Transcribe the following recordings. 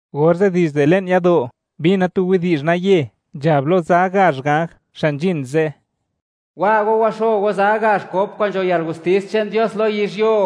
Orze' dizde le'n yado', mbina tu widi'zh naye nzhab lo za gazh ganj xa' nzhin ze': ―Wa go, waxo go za gazh kop kwa'n nzho yalgustis che'n Dios lo yizhyuo.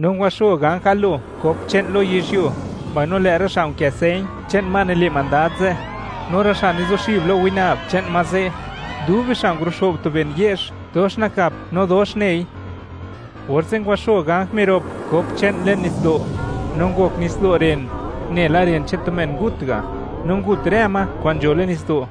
No ngwaxo ganj galo kop che'n lo yizhyuo, mbaino lë' rë xa' nkë señ che'n ma nile' mandad ze', no rë xa' nizuxib lo winab che'n ma ze', dub bixa' nguluxo'b tu ben ye'zh dox nakap no dox nei. Orze' ngwaxo ganj mirop kop che'n le'n nitsdo', no ngok nitsdo' ren, nela ren che'n tu men ngut ga', no ngut rë ma kwa'n nzho le'n nitsdo'.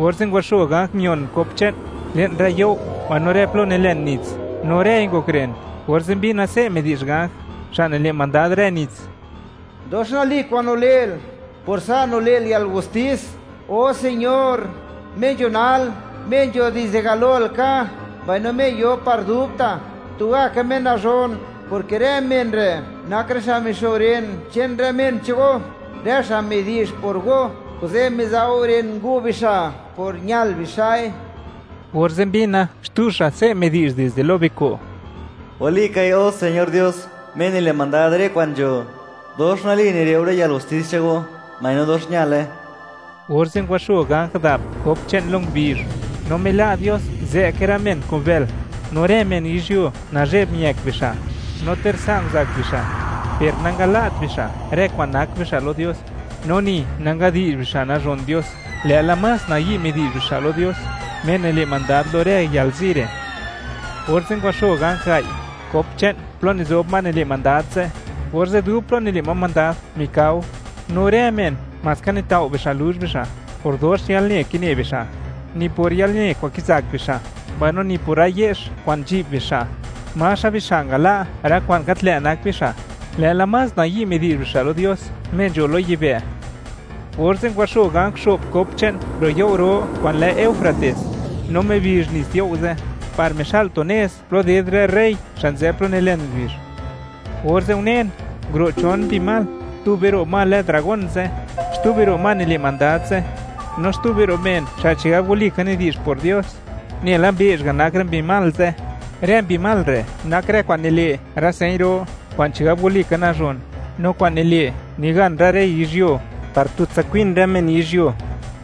Orze' ngwaxo ganj mion kop che'n le'n rë you' mbaino rë plo nilen nits, no rëi ngok ren. Orze' mbina se' midi'zh ganj xa' nile' mandad rë nits: ―Dox nali kwa'n nile'l, por sa' nile'l yalgustis, O Señor; Me nzho nal, Me nzho dizde galo laka, mbaino Me yo par dubta', tugaka Me nazhon, porke rë men re' nak rë xa' mixo ren che'n rë men che'n Go, rë xa' midi'zh por Go; kuze', miza' Go ren ngu' bixa' por ñal bixa'i. Orze' mbina, xtu xa' se' midi'zh dizde lo biko': ―Walikai, O Señor Dios, Me nile' mandad rë kwa'n nzho; dox nali nile' Go rë yalgustis che'n Go, mbaino dox ñale. Orze' ngwaxo ganj dap kop che'n lo ngubizh, no mila' Dios zë'ke rë men kun bël. No rë men yizhyuo, nazhe'b miëk bixa', no ter sa' nguzak bixa', per nangala't bixa' rë kwa'n nak bixa' lo Dios, no ni nangadi'zh bixa' nazhon Dios, lë'la más nayi' midi'zh bixa' lo Dios, Me nile' mandad lo rë yalzi re'. Orze' ngwaxo ganj gai', kop che'n plo nizob ma nile' mandad ze', orze' dub plo nile' ma mandad mikao, no rë men maska nitao' bixa' luzh bixa' por dox yalne kine bixa'. Ni por yalne kwa'n kizak bixa' mbaino ni por rë ye'zh kwa'n nzhi'b bixa', maxa bixa' ngala' rë kwa'n gat lë' nak bixa', lë'la más nayi' midi'zh bixa' lo Dios Me nzho lo yibë'. Orze' ngwaxo ganj xo'p kop che'n ro' you' ro kwa'n lë Eufrates, no mibizh nits you' ze' par mixa'l tu nez plo ded rë rey xa' nzë plo nilen ngubizh, orze' unen, nguro' chon mbi mal; tube ro' ma lë dragón ze', xtube ro' ma nile' mandad ze', no xtube ro' men xa' chigab walika nidi'zh por Dios; nela mbeezh ga' nak rë mbi mal ze'. Rë mbi mal re' nak rë kwa'n nile' rë señ ro kwa'n chigab walika nazhon, no kwa'n nile', nigan rë rey yizhyuo, par tutsa kwin rë men yizhyuo,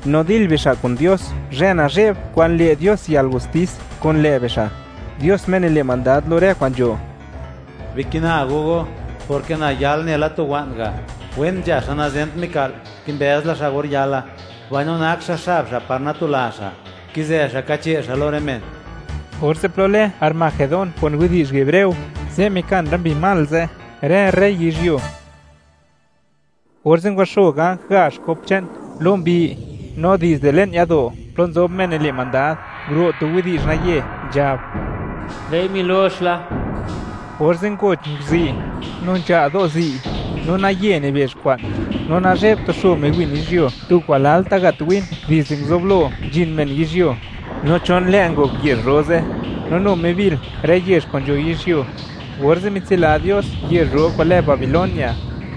no dil bixa' kun Dios, zhë nazhe'b kwa'n le' Dios yalgustis kun lë' bixa', Dios Me nile' mandad lo rë kwa'n nzho. “¡Bikina go go!, porke na yal nela tu wa'n ga'. Wen nzha xa' nazent mika'l, kimbëz la xa' or yala, mbaino nak xa' xab xa' par natula xa', kizë xa' kache' xa' lo rë men.” Orze' plo lë Armagedón, kun widi'zh hebreo, ze' mikan rë mbi mal ze', rë rey yizhyuo. Orze' ngwaxo ganj gazh kop che'n lo mbi, no dizde le'n yado' plo nzob Me nile' mandad, nguro' tu widi'zh naye, nzhab: ―¡Lë'i milox la! Orze' ngoch nguzi', no nzha' do' zi', no naye nibezh kwa'n, no nazhe'b tu xo miwin yizhyuo, tu kwa'n lalta' nagat win dizde nguzublo nzhin men yizhyuo. No chon lë' ngok yezh ro ze', no nu mibil rë yezh kwa'n nzho yizhyuo, orze' mitsila Dios yezh ro kwa'n lë Babilonia,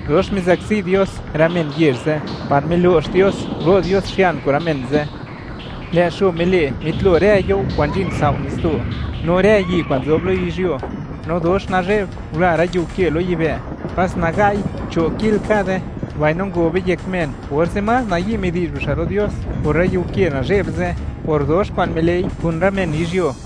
dox mizakzi Dios rë men yezh ze' par milo'x Dios ngulo' Dios xian kun rë men ze'. Lë' xo mile' mitlo rë yuo kwa'n nzhin sao' nitsdo', no rë yi' kwa'n nzob lo yizhyuo, no dox nazhe'b ngula rë yiu ke lo yibë'; pas naga'i cho' kil kade. Mbaino ngobe yek men, orze' más nayi' midi'zh bixa' lo Dios por rë yiu ke nazhe'b ze', por dox kwa'n mile'i kun rë men yizhyuo.